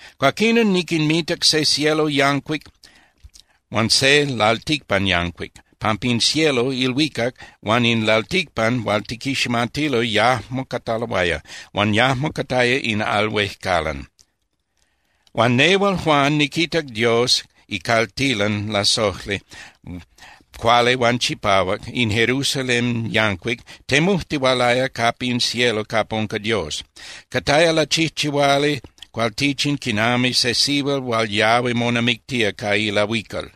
Cuaquinon niquinmitac se cielo yancuic huan se lalticpan yancuic, pampa in cielo (ilhuicac) huan in lalticpan hual tiquiximatilo yajmo cataloaya, huan yajmo cataya in al huejcalan. Huan nehual, Juan, niquitac Dios icaltilan lasojli, cuali huan chipahuac, in Jerusalén yancuic, temujtihualaya capa in cielo capa unca Dios. Cataya lachijchihuali cualtichin quinami se sihual hual yahui monamictía ca ilahuical.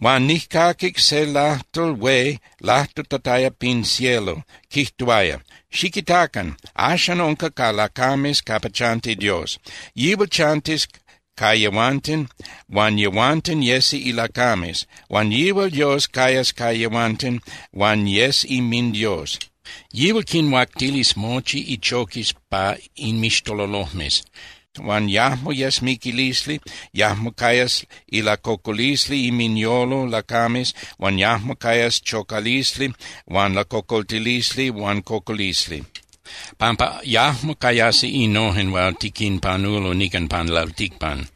Huan nijcaquic se lajtol hué lajtutataya pin cielo, quijtuaya: —Xiquitacan. Axan unca ca lacames capa chanti Dios. Yihual chantis ca yehuanten huan yehuanten yesi ilacames. Huan yihual Dios cayas ca yehuanten huan yes inminDios. Yihual quinhuactilis mochi ichoquis pa inmixtololojmes, huan yajmo yes miquilisli, yajmo cayas ilacocolisli inminyolo lacames, huan yajmo cayas chocalisli huan lacocoltilisli huan cocolisli, pampa yajmo cayasi innojen hual tiquinpanulo nican pan lalticpan.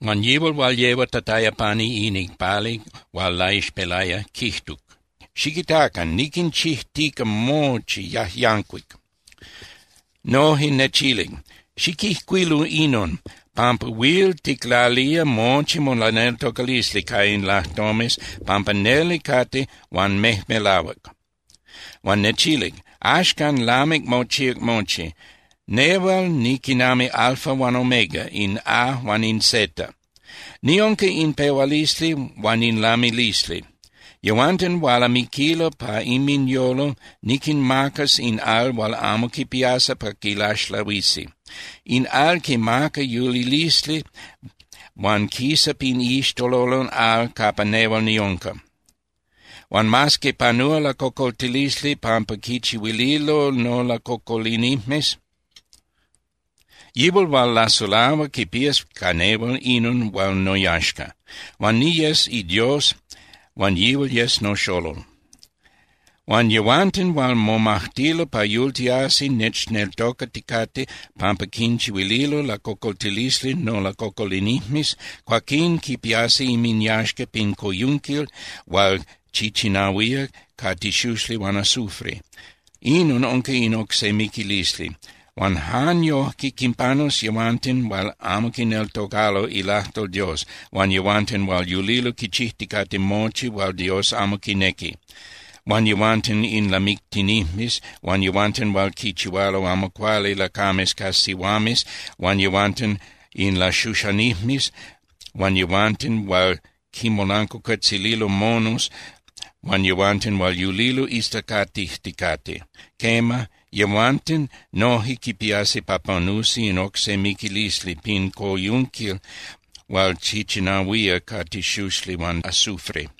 Huan yihual hual yehuatataya pani in icpali hual laixpelaya quijtuc: —Xiquitacan. Niquinchijtica mochi yajyancuic. Noje nechilic: —Xiquijcuilu inon, pampa huil ticlalía mochi molaneltocalisli ca in lajtomes pampa neli cate huan mejmelahuac. Huan nechilic: —Axcan lamic mochíac mochi. Nehual niquinami Alfa huan Omega, in A huan in Z. Niunca in pehualisli huan in lamilisli. Yehuanten hual amiquilo pa inminyolo niquinmacas in al huan amo quipiasi pa quilaxlahuisi. In al quimaca yulilisli huan quisa pin iixtololon al capa nehual niunca. Huan mas que panúa lacocoltilisli pampa quichihuililo nolacocolinijmes, yihual hual lasulahua quipías ca nehual inon hual noyaxca. Huan niyes iDios huan yihual yes noxolol. Huan yehuanten hual momajtilo pa yultiasi nechneltocaticate pampa quinchihuililo lacocoltilisli nolacocolinijmes, cuaquín quipiasi inminyaxca pin coyunquil hual chichinahuía ca tixuxli huan azufre. Inon unca in oc se miquilisli. Huan jan yojque quinpanus yehuanten hual amo quineltocalo ilajtol Dios huan yehuanten hual yulilo quichijticate mochi hual Dios amo quinequi, huan yehuanten in lamictinijmes huan yehuanten hual quichihualo amo cuali lacames ca sihuames huan yehuanten in laxuxanijmes huan yehuanten hual quinmolancuacuetzililo monos huan yehuanten hual yulilo islacatijticate. Quema, yehuanten noje quipiasi pa panus in oc se miquilisli pin coyunquil hual chichinahuía ca tixuxli huan azufre.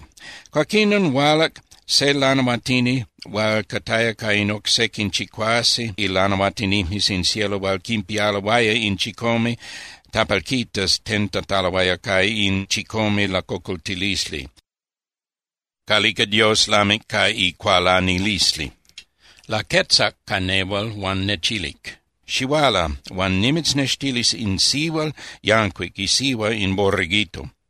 Cuaquinon hualac se lanahuatini hual cataya ca in oc sequin chicuase ilanahuatinijmes in cielo hual quinpialoaya in chicome (siete) tapalquitas tentataloaya ca in chicome lacocoltilisli, calica Dios lamic ca icualanilisli. Laquetzac ca nehual huan nechilic: —Xihuala, huan nimitznextilis in sihual yancuic, isihua in Borreguito.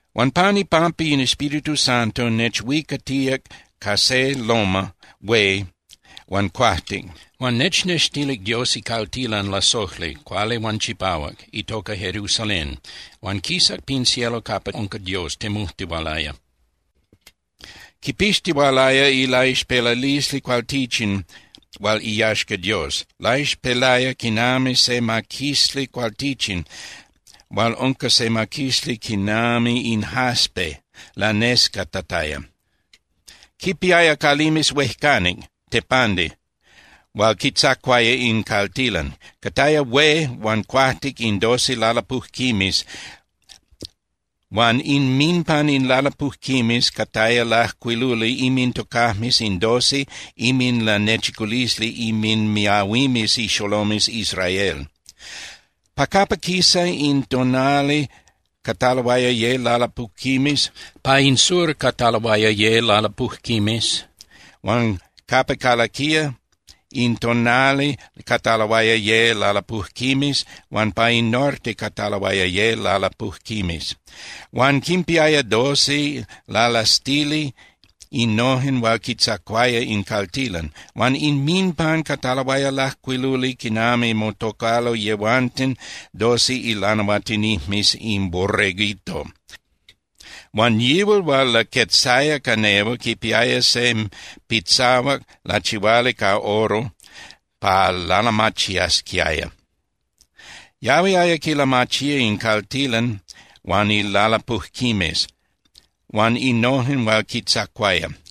Huan pan ipampa in Espíritu Santo, nechhuicatíac ca se loma (tepel) hué huan cuajtic, huan nechnextilic Dios icaltilan lasojli, cuali huan chipahuac, itoca Jerusalén. Huan quisac pin cielo capa unca Dios, temujtihualaya. Quipixtihualaya ilaixpelalisli cualtichin hual iyaxca Dios, laixpelaya quinami se maquisli cualtichin hual unca se maquisli quinami in jaspe, lanescatataya. Quipiaya calimes huejcanic (tepandi) hual quitzacuaya in caltilan. Cataya hué huan cuajtic ca doce lalapujquimes huan inminpan in lalapujquimes cataya lajcuiluli inmintocajmes in doce inminlanechiculisli inminmiahuimes ixolomes Israel. Pa capa quisa in tonali cataloaya ye lalapujquimes, pa in sur cataloaya ye lalapujquimes, huan capa calaquía in tonali cataloaya ye lalapujquimes huan pa in norte cataloaya ye lalapujquimes. Huan quinpiaya doce lalastili innojen hual quitzacuaya in caltilan. Huan inminpan cataloaya lajcuiluli quinami motocalo yehuanten doce ilanahuatinijmes in Borreguito. Huan yihual hual laquetzaya ca nehual quipiaya se pitzahuac lachihuali ca oro pa lalamachiasquiaya. Yahuiaya quilamachía in caltilan huan ilalapujquimes huan innojen hual quitzacuaya.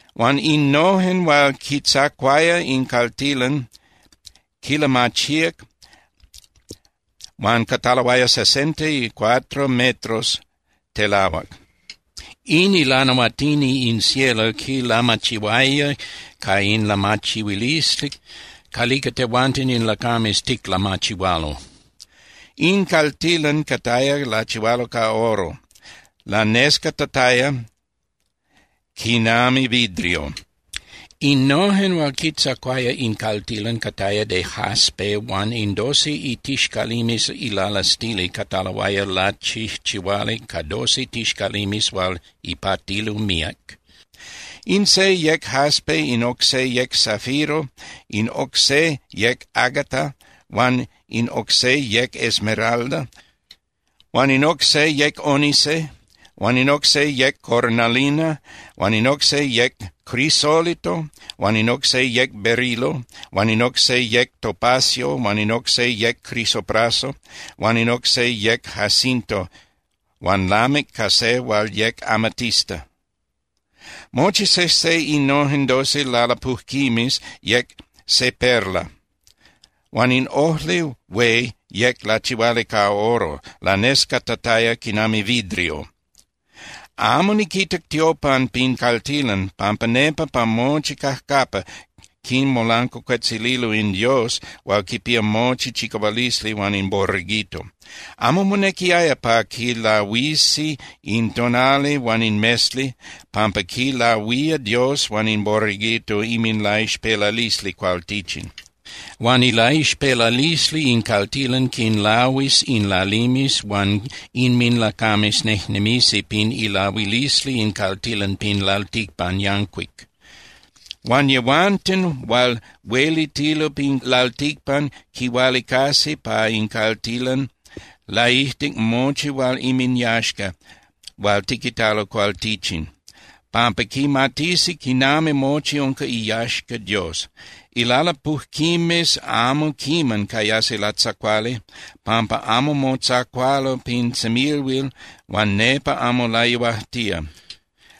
Huan innojen hual quitzacuaya in caltilan quinlamachíac, huan cataloaya sesenta y cuatro metros telahuac. In ilanahuatini in cielo quilamachihuaya ca in lamachihuilisli calica tehuanten in lacames ticlamachihualo. In caltilan cataya lachihuali ca oro, lanescatataya quinami vidrio. Innojen hual quitzacuaya in caltilan cataya de jaspe huan in doce itixcalimes ilalastili cataloaya lachijchihuali ca doce tixcalimes hual ipatilo míac. In se yec jaspe, in oc se yec zafiro, in oc se yec ágata, huan in oc se yec esmeralda. Huan in oc se yec ónice, huan in oc se yec cornalina huan in oc se yec crisólito huan in oc se yec berilo, huan in oc se yec topacio, huan in oc se yec crisopraso, huan in oc se yec jacinto, huan lamic ca se hual yec amatista. Mochi sejse innojen doce lalapujquimes yec se perla, huan in ojli hué yec lachihuali ca oro, lanescatataya quinami vidrio. Amo niquitac tiopan pin caltilan pampa nepa pa mochi cajcapa quinmolancuacuetzililo in Dios hual quipía mochi chicahualisli huan in Borreguito. Amo monequiaya pa quilahuisi in tonali huan in mesli, pampa quilahuía Dios huan in Borreguito inminlaixpelalisli cualtichin. Huan ilaixpelalisli in caltilan quinlahuis in lalimes huan inminlacames nejnemisi pin ilahuilisli in caltilan pin lalticpan yancuic. Huan yehuanten hual huelitilo pin lalticpan quihualicasi pa in caltilan laijtic mochi hual inminyaxca hual tiquitalo cualtichin, pampa quimatisi quinami mochi unca iyaxca Dios. Ilalapujquimes amo quiman cayasi latzacuali, pampa amo motzacualo pin semilhuil huan nepa amo layuajtía.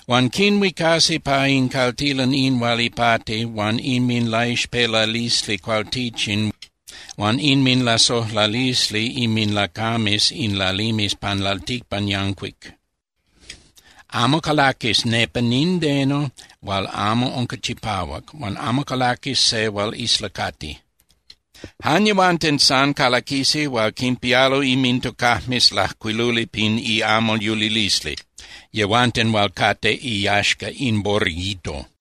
Huan quinhuicasi pa in caltilan in hual ipati huan inminlaixpelalisli cualtichin huan inminlasojlalisli inminlacames in lalimes pan lalticpan yancuic. Amo calaquis nepa nindeno hual amo unca chipahuac, huan amo calaquis se hual islacati. Jan yehuanten san calaquisi hual quinpialo inmintocajmes lajcuiluli pin iamal yulilisli, yehuanten hual cate iyaxca in Borreguito.